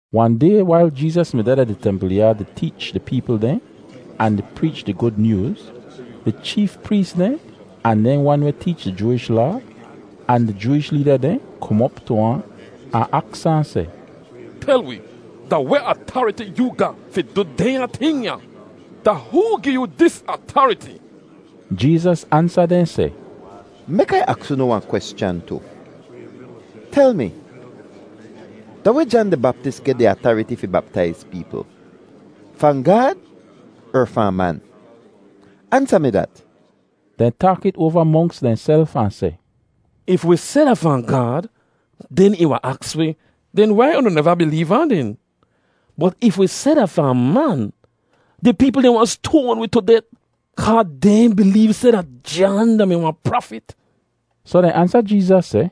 Wahn day wail Jeezas mi deh da di templ yaad di teech di peepl dehn ahn di preech di Gud Nyooz, di cheef prees dehn, ahn dehn wan weh teech di Jooish Laa, ahn di Jooish leeda dehn kom op tu ahn, ahn aks ahn seh, “Tel wi, da weh atariti yoo ga fi du dehnya ting ya? Da hoo gi yoo dis atariti?” Jeezas ansa dehn seh, “Mek Ai aks unu wahn kweschan tu. Tel mi, da weh Jan di Baptis geh di atariti fi baptaiz peepl—fahn Gaad er fahn man? Ansa mi dat!” Dehn taak it oava monks dehnself ahn seh, “If wi seh da fahn Gaad, den ih wahn aks wi, ‘Den wai unu neva bileev ahn den?’ Bot if wi seh da fahn man, di peepl dehn wahn stoan wi tu det kaa dehn bileev seh dat Jan da-mi wahn prafit.” Soh dehn ansa Jeezas seh,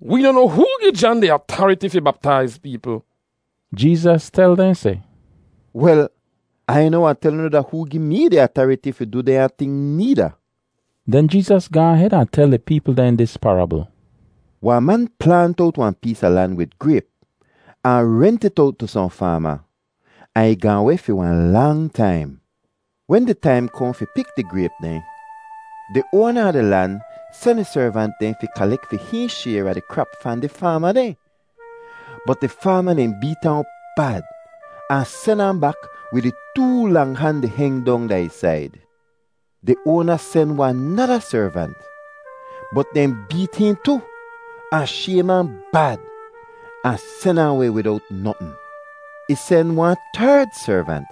“Wee noh noa hoo gi Jan di atariti fi baptaiz peepl.” Jeezas tel dehn seh, “Wel, Ai noh wahn tel unu da hoo gi mee di atariti fi du dehnya ting needa.” Den Jeezas gaahn hed ahn tel di peepl dehn dis parabl: “Wahn man plaant owt wahn pees a lan wid grayp ahn rent it owt tu sohn faama, ahn ih gaahn weh fi wahn lang taim. Wen di taim kohn fi pik di grayp dehn, di oana a di lan sen ih servant dehn fi kalek fi hihn shayr a di krap fahn di faama dehn. Bot di faama dehn beet ahn op bad ahn sen ahn bak wid ih too lang han di heng dong da ih said. Di oana sen wahn nada servant, bot dehn beet hihn tu, ahn shaym ahn bad, ahn sen ahn weh widowt notn. Ih sen wahn terd servant,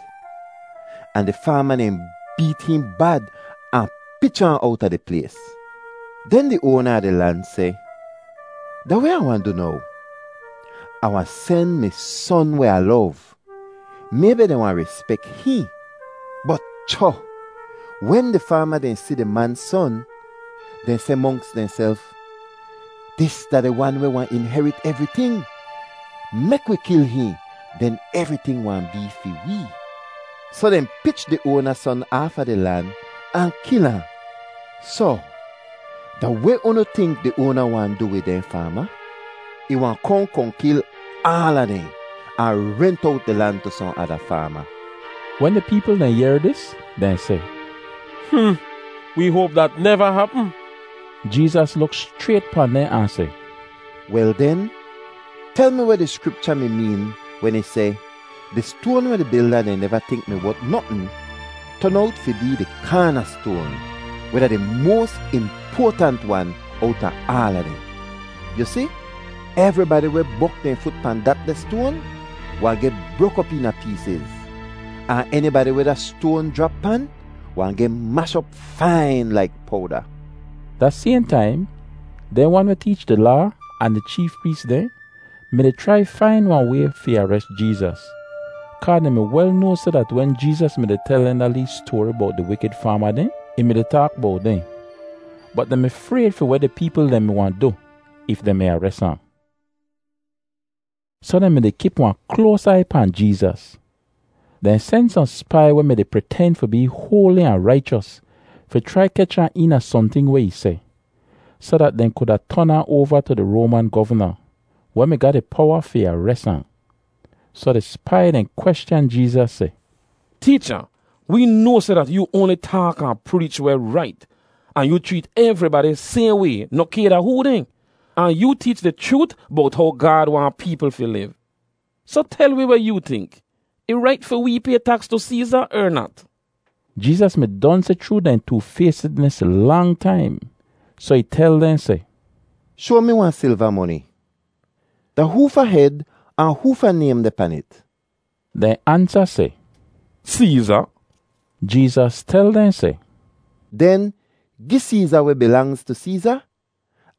ahn di faama dehn beet hihn bad ahn pich ahn owta di plays. “Den di oana a di lan seh, ‘Da weh Ah wahn du now? Ah wahn sen mi son weh Ah lov. Maybi dehn wahn rispek hihn!’ “Bot cho! Wen di faama dehn si di man son, dehn seh monks dehnself, ‘Dis da di wan weh wahn inherit evriting. Mek wi kil hihn, den evriting wahn bee fi wee!’ Soh dehn pich di oana son aafa di lan ahn kil ahn. “Soh da weh unu tink di oana wahn du wid dehn faama? Ih wahn kohn kohn kil aala dehn ahn rent owt di lan tu sohn ada faama.” Wen di peepl dehn yehr dis, dehn seh, “Hmm! Wee hoap dat neva hapm!” Jeezas luk schrayt pahn dehn ahn seh, “Wel den, tel mi weh di Skripcha mi meen wen ih seh, ‘Di stoan weh di bilda dehn neva tink mi wot notn ton owt fi bee di kaanastoan, weh da di moas impoatant wan owta aala dehn.’ Yu si, evribadi weh bok dehn fut pahn datdeh stoan wahn geh brok op eena peesiz; ahn enibadi weh da stoan jrap pan wahn geh mash op fain laik powda.” Da sayhn taim, dehn wan weh teech di Laa ahn di cheef prees dehn mi-di chrai fain wahn way fi ares Jeezas, kaa dehn mi wel noa seh dat wen Jeezas mi-di tel dehn da lee stoari bowt di wikid faama dehn, ih mi-di taak bowt dehn. Bot dehn mi frayd fi weh di peepl dehn mi wahn du if dehn mi ares ahn. Soh dehn mi-di kip wahn kloas aiy pahn Jeezas. Dehn sen sohn spai weh mi-di priten fi bee hoali ahn raichos fi chrai kech ahn eena sohnting weh ih seh, soh dat dehn kuda ton ahn oava tu di Roaman govna, weh mi ga di powa fi ares ahn. Soh di spai dehn kweschan Jeezas seh, “Teecha, wee noa seh dat yoo oanli taak ahn preech weh rait, ahn yu chreet evribadi sayhn way noh kay da hoo dehn, ahn yoo teech di chroot bowt how Gaad waahn peepl fi liv. Soh tel wi weh yoo tink. Ih rait fi wee pay taks tu Seeza er nat?” Jeezas mi don si chroo dehn toofaystidnis lang taim, soh ih tel dehn seh, “Shoa mi wahn silva moni. Da hoofa hed ahn hoofa naym deh pan it?” Dehn ansa seh, “Seeza.” Jeezas tel dehn seh, “Den gi Seeza weh bilangz tu Seeza,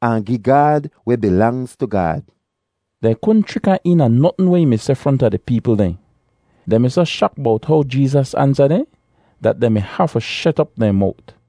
ahn gi Gaad weh bilangz tu Gaad.” Dehn kudn chrik ahn eena notn weh ih mi seh fronta di peepl dehn. Dehn mi soh shak bowt how Jeezas ansa dehn, dat dehn mi hafu shet op dehn mowt.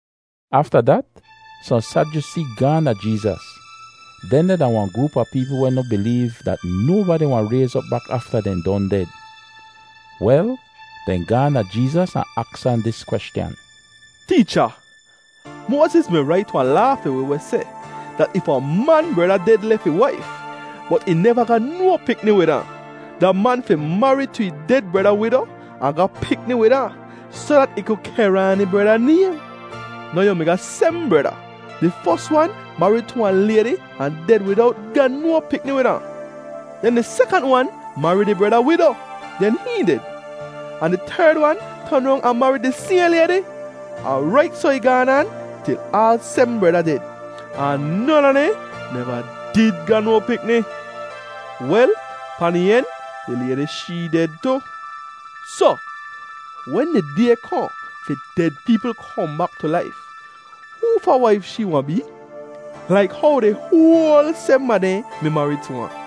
Afta dat sohn Sadyusee gaahn da Jeezas. Dehndeh da wahn groop a peepl weh noh bileev dat nobadi wahn rayz op bak afta dehn don ded. Wel, dehn gaahn da Jeezas ahn aks ahn dis kweschan: “Teecha, Moaziz mi rait wahn laa fi wi weh seh dat if wahn man breda ded lef ih waif, bot ih neva ga no pikni wid ahn, da man fi marid tu ih ded breda wido ahn ga pikni wid ahn soh dat ih ku kehr aan ih breda naym. Now yu mi ga sebm breda; di fos wan marid tu wahn laydi ahn ded widowt ga no pikni wid ahn; den di sekant wan marid ih breda wido; den hihn ded, ahn di terd wan ton rong ahn marid di sayhn laydi. Ahn rait soh ih gaan aan til aal sebm breda ded, ahn non a dehn neva did ga no pikni. Wel, pahn di en di laydi shee ded tu. Soh, wen di day kohn fi ded peepl kohn bak tu laif, hoofa waif shee wahn bee, laik how di hoal sebm a dehn mi marid tu ahn?”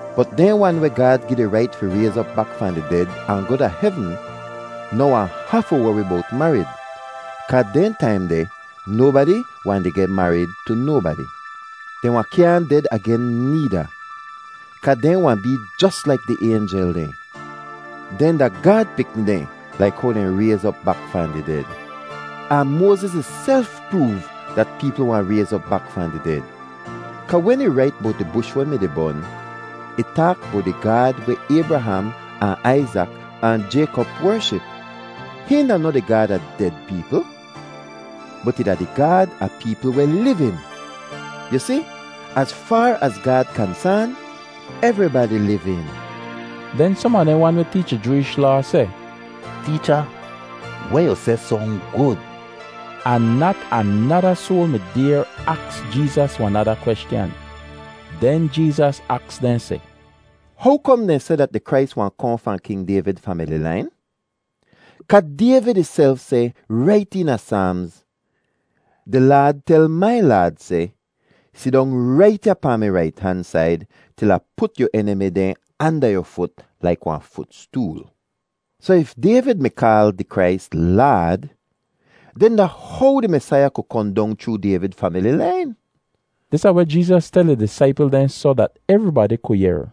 Bot dehn wan weh Gaad gi di rait fi rayz op bak fahn di ded ahn goh da hevn noh wahn hafu wori bowt marid kaa dehn taim deh nobadi wahn di geh marid tu nobadi. Dehn wahn kyaahn ded agen needa, kaa dehn wahn bee jos laik di aynjel dehn. Dehn da Gaad pikni dehn laik how dehn rayz op bak fahn di ded. Ahn Moaziz ihself proov dat peepl wahn rayz op bak fahn di ded kaa wen ih rait bowt di bush weh mi-di bon, ih taak bowt di Gaad weh Aybraham ahn Aizak ahn Jaykop wership. Hihn da noh di Gaad a ded peepl, bot ih da di Gaad a peepl weh livin. Yu si, az faar az Gaad kansaan, evribadi livin.” Den som a dehn wan weh teech di Jooish Laa seh, “Teecha, weh yu seh song gud.” Ahn nat anada soal mi dayr aks Jeezas wahn nada kweschan. Den Jeezas aks dehn seh, “How kom dehn seh dat di Krais wahn kohn fahn King Dayvid famili lain? Kaa Dayvid ihself seh rait eena Saamz, ‘Di Laad tel mai Laad seh, “Sidong rait ya pahn mi rait han said til Ah put yu enimi dehn anda yu fut laik wahn futstool.” ’ Soh if Dayvid mi kaal di Krais, ‘Laad,’ den da how di Mesaiya ku kohn dong chroo Dayvid famili lain?” Dis da weh Jeezas tel ih disaipl dehn soh dat evribadi ku yehr: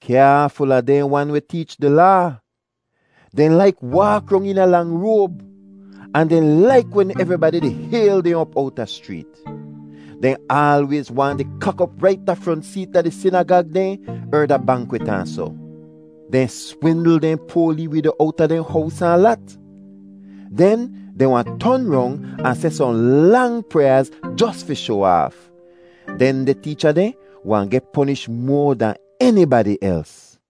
“Kyaaful a dehn wan weh teech di Laa. Dehn laik waak rong eena lang roab, ahn dehn laik wen evribadi di hayl dehn op owta schreet. Dehn aalwayz waahn di kak op rait da front seet da di sinagag dehn er da bankwit ahn soh. Dehn swindl dehn poa lee wido owta dehn hows ahn lat, den dehn wahn ton rong ahn seh sohn lang pryaaz jos fi shoa aaf. Dehndeh teecha dehn wahn geh ponish moa dahn enibadi els.”